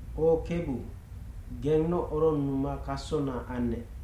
O Kebu, gennoc oronnuma kasona annec.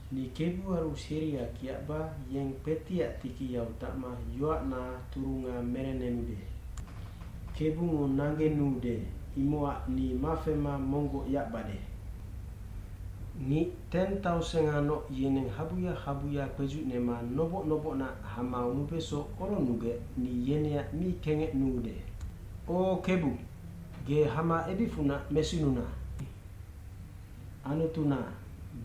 Ni kebuaru seria kiacba yeng kpetiac tikiyau tacma yoacna turunga merennenude. Kebungo nanggenuude, imocac ni mafema monggoc yacbade. Ngic teng taoseng nga noc yeneng habuya habuya kpedzucnema noboc nobocnac hama nubeso oronnugec ni yeneac mi kengecnuude.d O Kebu, ge hama ebicfunac mesinuna. Anutuna,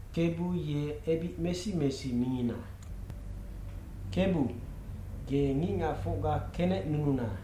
Kebu ye ebic mesi mesi mingina. Kebu, ge ngicngacfocga kenecnununa.